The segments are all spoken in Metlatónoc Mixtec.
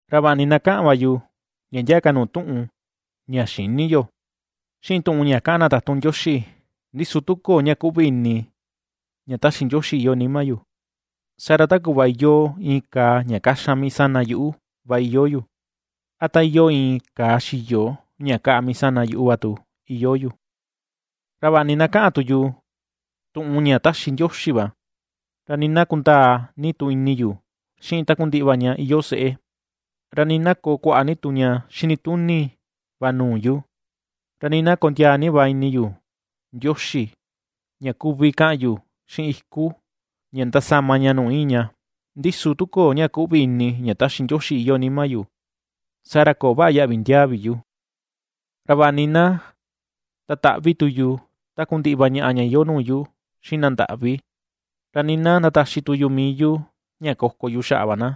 Ra vaꞌa ni na kaꞌan va yu ndia ndia ka nuu tuꞌun ña xïni yo, xiꞌin tuꞌun ña kaꞌan na tatun Ndioxi, ndi su tu köo ña kuꞌvi ini ña taxi Ndioxi iyoo nima yu, saa ra ta kuꞌva iyoo iin kaa ña kaxan mii sana yuꞌu va iyoo yu, a ta iyoo iin kaa xiyo ña kaꞌa mii sana yuꞌu va tu iyoo yu. Ra vaꞌa ni na ^kaꞌan tu yu tuꞌun ña ^taxi Ndioxi va, ra nii na kundaa ini tu yu xiꞌin takundiꞌi va ña iyoo seꞌé, ra nii na koo kuaꞌa ni tu ña xinituni va nuu yu, ra nii na kondiaa ni va ini yu Ndioxi ña kuvi kaꞌan yu xiꞌin iku ña ndasama ña nuu iin ña, ndi su tu köo ña kuꞌvi ini ña taxi Ndioxi iyoo nima yu, saa ra ^köo vaꞌa yaꞌvi ndiaa vi yu. Ra vaꞌa nii na ndataꞌvi tu yu takundiꞌi va ñaꞌa ña iyoo nuu yu xiꞌin na ndaꞌvi, ra nii na ndataxi tu yu mii yu ña koko yu xaꞌa va na,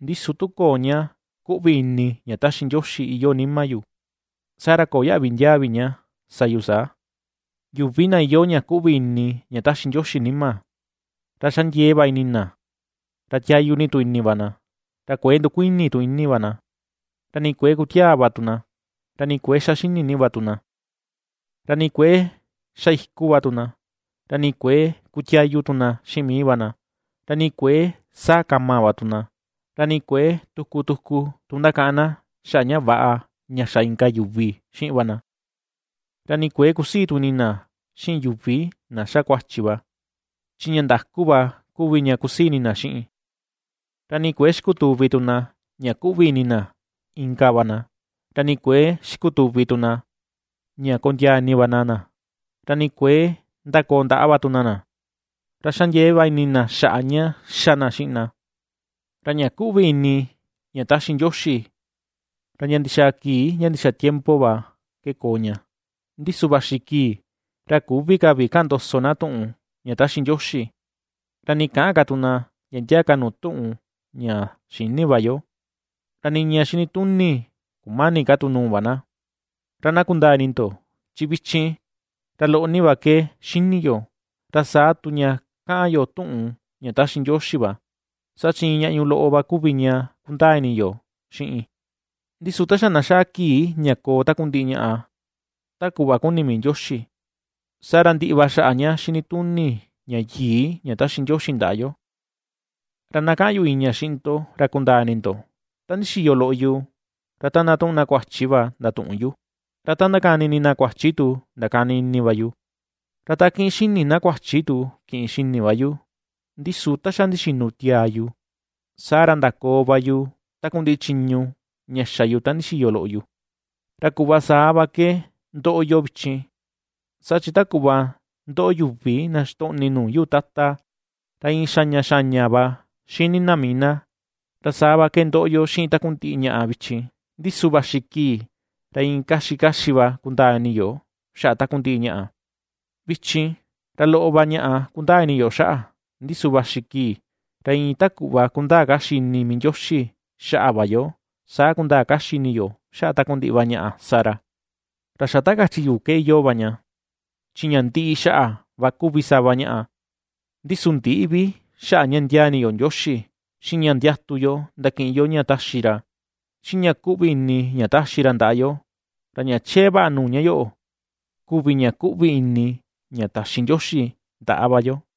ndi su tu köo ña kuꞌvi ini ña taxi Ndioxi iyoo nima yu, saa ra ^köo yaꞌvi ndiaa vi ña sa yu saa. Yuvi na iyoo ña kuꞌvi ini ña taxi Ndioxi nima, ra xa ndiee va ini na, ra tiayu ni tu ini va na, ra kuëe ndukuini tu ini va na; ra nii kuëe kutiaa va tu na, ra nii kuëe xa xini ni va tu na. Ra nii kuëe xa iku va tu na, ra nii kuëe kutiayu tu na xiꞌin mii va na; ra nii kuëe saa kama va tu na, ra nii kuëe tuku tuku tu ndakaꞌan na xaꞌa ña väꞌa ña xa inka yuvi xiꞌin va na. Ra nii kuëe kusii tu ini na xiꞌin yuvi na xa kuachi va, chi ña ndaku va kuvi ña kusii ini na xiꞌin. Ra nii kuëe xikutuvi tu na ña kuꞌvi ini na inka va na, ra nii kuëe xikutuvi tu na ña kondiaa ini va na na, ra nii kuëe ndakoo ndaꞌa va tu na na, ra xa ndiee va ini na xiꞌin na xaꞌa ña ^xa na xiꞌin na. Ra ña kuꞌvi ini ña taxi Ndioxi, ra ndia ndixaa kii ndia ndixaa tiempo va ke koo ña. Ndi su vaxi kii, ra küvi ka vi kaꞌan ndoso na tuꞌun ña ^taxi Ndioxi, ra nii käꞌan ka tu na ndia ndia ka tu nuu tuꞌun ña xïni va yo, ra nii ña xinituni kumäni ka tu nuu va na. Ra na kundaa ini ndo, chi vichin ra loꞌo ni va ke xíní yo, ra saa tu ña káꞌán yo tuꞌun ña taxi Ndioxi va, saa chi iin ñaꞌñu loꞌo va kuvi ña ^kundaa ini yo xiꞌin. Ndi su ta xa na xaa kii ña koo takundiꞌi ñaꞌa ta kuꞌva kuni mii Ndioxi, saa ra ndiꞌi va xaꞌa ña xinituni ña yii ña taxi Ndioxi ndaꞌa yo. Ra na kaꞌan yu iin ña xiꞌin ndo ra kundaa ini ndo, ta ndixiyo loꞌo yu, ra ta ^ndatuꞌun na kuachi va ndatuꞌun yu, ra ta ^ndakani ini na kuachi tu ndakani ini va yu, ra ta ^kiꞌin xini na kuachi tu kiꞌin xini va yu; ndi su ta xa ndixinu tiaa yu, saa ra ndakoo va yu takundiꞌi chiñu ña xa yu ta ndixiyo loꞌo yu. Ra kuꞌva saa va ke ndoꞌo yo vichin, saa chi ta kuꞌva ndoꞌo yuvi na xitoꞌni nuu yuu tata, ra iin xaña xaña va xini na mii na, ra saa va ke ^ndoꞌo yo xiꞌin takundiꞌi ñaꞌa vichin; ndi su vaxi kii ra iin kaxi kaxi va kundaa ini yo xaꞌa takundiꞌi ñaꞌa. Vichin, ra loꞌo va ñaꞌa kundaa ini yo xaꞌa, ndi su vaxi kii, ra iin ta kuꞌva kundaa kaxi ini mii Ndioxi xaꞌa va yo, saa kundaa kaxi ini yo xaꞌa takundiꞌi va ñaꞌa sa ra. Ra xa ta kachi yu ke iyoo va ña, chi ña ndiꞌi xaꞌa va kuvi sava ñaꞌa, ndi su ndïꞌi vi xaꞌa ña ndiaa ini yo Ndioxi, xiꞌin ña ndiatu yo ndakiꞌin yo ña taxi ra, xiꞌin ña kuꞌvi ini ña taxi ra ndaꞌa yo, ra ña chee vaꞌa nuu ña yoꞌo kuvi ña kuꞌvi ini ña taxi Ndioxi ndaꞌa va yo.